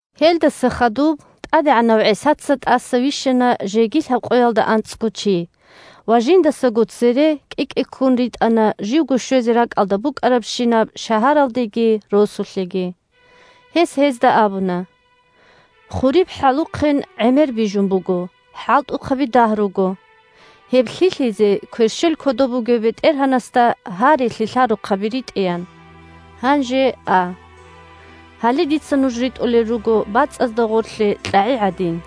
Гьелдаса хадуб ТӀадегӀанав ГӀисаца тӀаса вищана жеги лъабкъоялда анцӀго чи ва жиндасаго цере кӀи-кӀиккун ритӀана живго щвезе ракӀалда букӀарабщинаб шагьаралдеги росулъеги. Гьес гьезда абуна: – Хуриб хӀалухъен гӀемер бижун буго, хӀалтӀухъаби дагь руго. Гьеб лъилъизе кверщел кодоб бугев БетӀергьанасда гьаре лъилъарухъаби ритӀеян. Гьанже а! Гьале дица нуж ритӀулел руго бацӀазда гъорлъе кьагӀи гӀадин.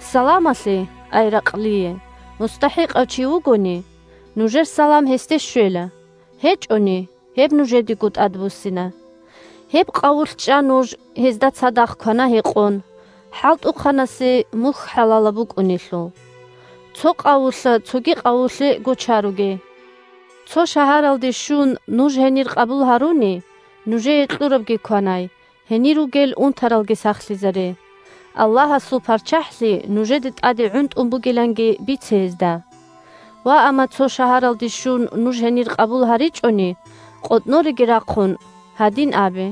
Саламалъе (ай ракълие) мустахӀикъав чи вугони – нужер салам гьесде щвела, гьечӀони – гьеб нужедего тӀадбуссина. Гьеб къавулъ чӀа нуж, гьезда цадахъ квана-гьекъон, – хӀалтӀухъанасе мухь хӀалалаб букӀунелъул. Цо къавулъа цоги къавулъе гочаруге. Цо шагьаралде щун, нуж гьенир къабул гьаруни, нужее кьурабги кванай, гьенир ругел унтаралги сахлъизаре, Аллагьасул ПарччахӀлъи нужеде тӀаде гӀунтӀун бугиланги бице гьезда. Ваамма цо шагьаралде щун, нуж гьенир къабул гьаричӀони, къотӀнореги рахъун, гьадин абе: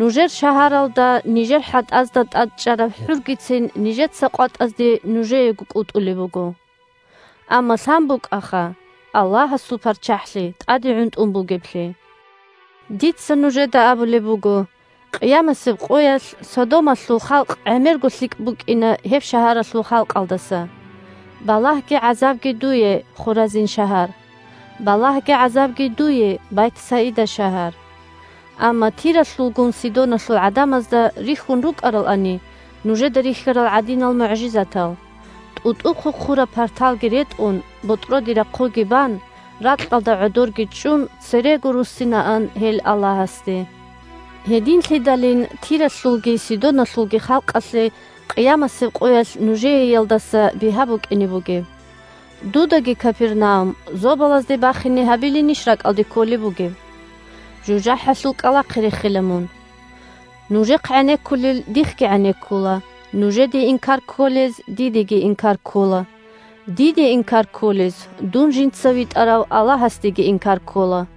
«Нужер шагьаралда нижер хӀатӀазда тӀад чӀараб хӀургицин нижеца къватӀазде нужеего кӀутӀулеб буго. Амма лъан букӀаха Аллагьасул ПарччахӀлъи тӀаде гӀунтӀун бугеблъи». Дица нужеда абулеб буго: къиямасеб къоялъ Содомалъул халкъ гӀемерго лъикӀ букӀина гьеб шагьаралъул халкъалдаса. Балагьги гӀазабги дуе, Хоразин шагьар! Балагьги гӀазабги дуе, Байтсаида шагьар! Амма Тиралъулгун Сидоналъул гӀадамазда рихьун рукӀаралани нужеда рихьарал гӀадинал мугӀжизатал, тӀутӀу-хъухъураб парталги ретӀун, ботӀроде рахъуги бан, ракьалда гӀодорги чӀун Гьедин загьир гьабула жугьутӀаз ракӀ бухӀун бугеблъи., церего руссинаан гьел Аллагьасде. Гьединлъидалин Тиралъулги Сидоналъулги халкъалъе къиямасеб къоялъ нужееялдаса бигьа букӀине бугеб! Дудаги, Капернаум, зобалазде бахине гьабилинищ ракӀалде кколеб бугеб? ЖужахӀалъул кӀкӀалахъе рехила мун! Нужехъ гӀенеккулел дихъги гӀенеккула, нужеде инкар кколез дидеги инкар ккола, диде инкар кколез дун жинца витӀарав Аллагьасдеги инкар ккола.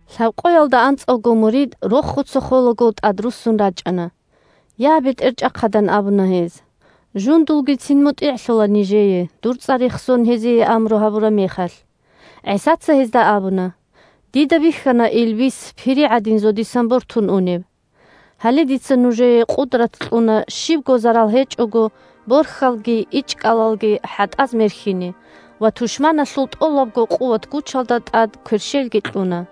Лъабкъоялда анцӀавго мурид рохуца холаго тӀадруссун рачӀана. – Я, БетӀерчӀахъад! – ан абуна гьез. – Жундулгицин мутӀигӀлъула нижее, дур цӀар рехсон гьезие амру гьабураб мехалъ. ГӀисаца гьезда абуна: – Дида бихьана илбис пири гӀадин зодисан бортун унеб! Гьале дица нужее къудрат кьуна щибго зарал гьечӀого борхьалги ичӀкӀалалги хӀатӀаз мерхьине ва тушманалъул тӀолабго къуват-гучалда тӀад кверщелги кьуна.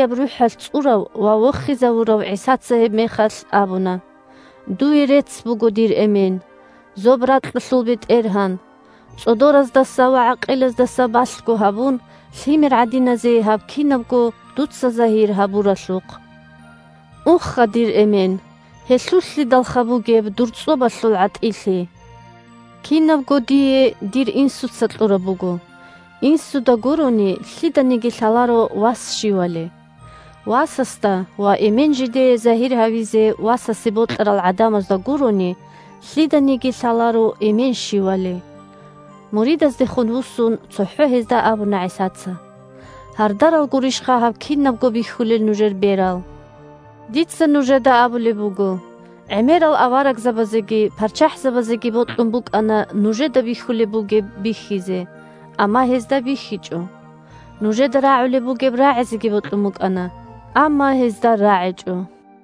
Илагьияб РухӀалъ цӀурав ва вохизавурав ГӀисаца гьебмехалъ абуна: – Дуе рецц буго, дир Эмен, зоб-ракьалъул БетӀергьан, цӀодораздаса ва гӀакъилаздаса балъго гьабун, лъимер гӀадиназе гьаб кинабго дуца загьир гьабуралъухъ. Уха, дир Эмен, гьелъулълъидалха бугеб дур цӀобалъул гӀатӀилъи! Кинабго дие дир Инсуца кьураб буго. Инсуда гурони, лъиданиги лъаларо Вас щивали. Васасда ва Эмен жидее загьир гьавизе Васасе бокьарал гӀадамазда гурони, лъиданиги лъаларо Эмен щивали. Муридаздехун вуссун, цохӀо гьезда абуна ГӀисаца: – Гьардарал гурищха гьаб кинабго бихьулел нужер берал. Дица нужеда абулеб буго: гӀемерал аварагзабазеги парччахӀзабазеги бокьун букӀана нужеда бихьулеб бугеб бихьизе, амма гьезда бихьичӀо. Нужеда рагӀулеб бугеб рагӀизеги бокьун букӀана, амма гьезда рагӀичӀо.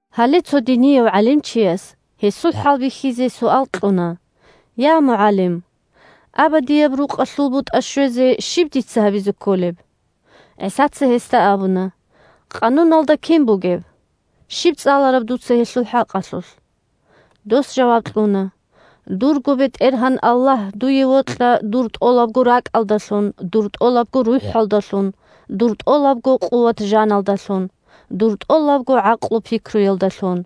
Гьале цо динияв гӀалимчияс, гьесул хӀалбихьизе, суал кьуна: – Я, МугӀалим! Абадияб рукъалъул бутӀа щвезе щиб дица гьабизе кколеб? ГӀисаца гьесда абуна: – Къануналда кин бугеб? Щиб цӀалараб дуца гьелъул хӀакъалъулъ? Дос жаваб кьуна: – «Дурго БетӀергьан Аллагь дуе вокьа дур тӀолабго ракӀалдалъун, дур тӀолабго рухӀалдалъун, дур тӀолабго къуват-жаналдалъун, дур тӀолабго гӀакълу-пикруялдалъун»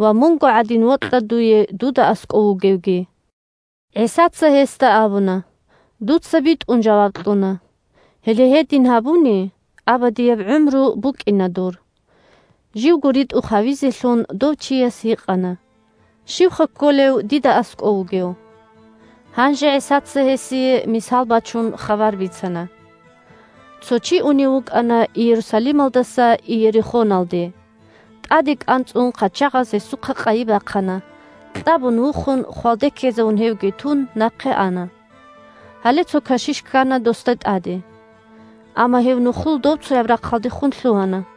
ва «Мунго гӀадин вокьа дуе дуда аскӀов вугевги». ГӀисаца гьесда абуна: – Дуца битӀун жаваб кьуна. Гьеле гьедин гьабуни, абадияб гӀумру букӀина дур. Живго ритӀухъ гьавизелъун, дов чияс гьикъана: – Щивха кколев «дида аскӀов вугев»? Гьанже ГӀисаца гьесие, мисал бачун, хабар бицана: – Цо чи унев вукӀана Иерусалималдаса Иерихоналде. ТӀаде кӀанцӀун хъачагъаз гьесухъа къайи бахъана, кьабун-вухун, хвалде ккезавун гьевги тун, нахъе ана. Гьале цо кашиш ккана досда тӀаде, амма гьев нухлул добцояб рахъалдехун лъугьана.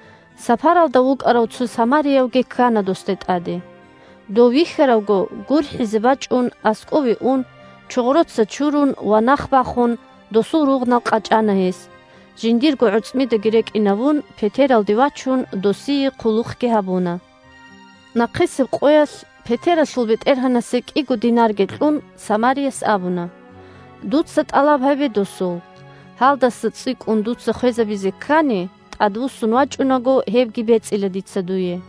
Сапаралда вукӀарав цо самариявги ккана досда тӀаде. Дов вихьаравго, гурхӀизе бачӀун, аскӀове ун, чогъроца чурун ва нах бахун, досул ругънал къачӀана гьес, жиндирго гӀорцӀмидаги рекӀинавун, петералде вачун, досие хъулухъги гьабуна. Нахъисеб къоялъ, петералъул бетӀергьанасе кӀиго динарги кьун, самарияс абуна: «Дуца тӀалаб гьабе досул. Гьалдаса цӀикӀкӀун дуца хвезабизе ккани, тӀадвуссун вачӀунаго гьебги бецӀила дица дуе».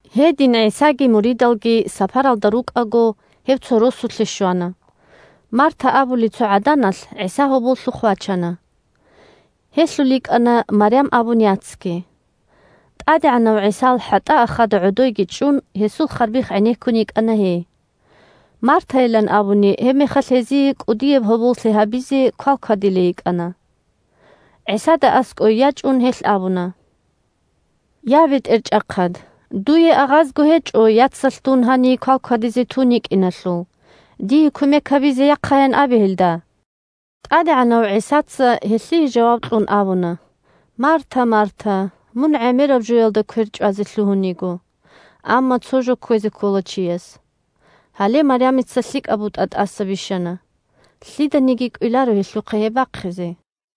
Гьедин ГӀисаги муридалги сапаралда рукӀаго, гьев цо росулъе щвана. Марта абулей цо гӀаданалъ ГӀиса гьоболлъухъ вачана. Гьелъул йикӀана Марям абун яцги. ТӀадегӀанав ГӀисал хӀатӀаахада гӀодойги чӀун, гьесул харбихъ гӀенеккун йикӀана гьей. Мартайилан абуни, гьебмехалъ гьезие кӀудияб гьоболлъи гьабизе квалквадилей йикӀана. ГӀисада аскӀое ячӀун, гьелъ абуна: – Я, БетӀерчӀахъад! Дуе агъазго гьечӀо яцалъ дун гьаний квалквадизе тун йикӀиналъул. Дие кумек гьабизе яхъаян абе гьелда. ТӀадегӀанав ГӀисаца, гьелъие жаваб кьун, абуна: – Марта! Марта! Мун гӀемераб жоялда квер чӀвазе лъугьун йиго, амма цо жо кквезе ккола чияс. Гьале Марямица лъикӀаб бутӀа тӀаса бищана, лъиданиги кӀвеларо гьелъухъа гьеб бахъизе.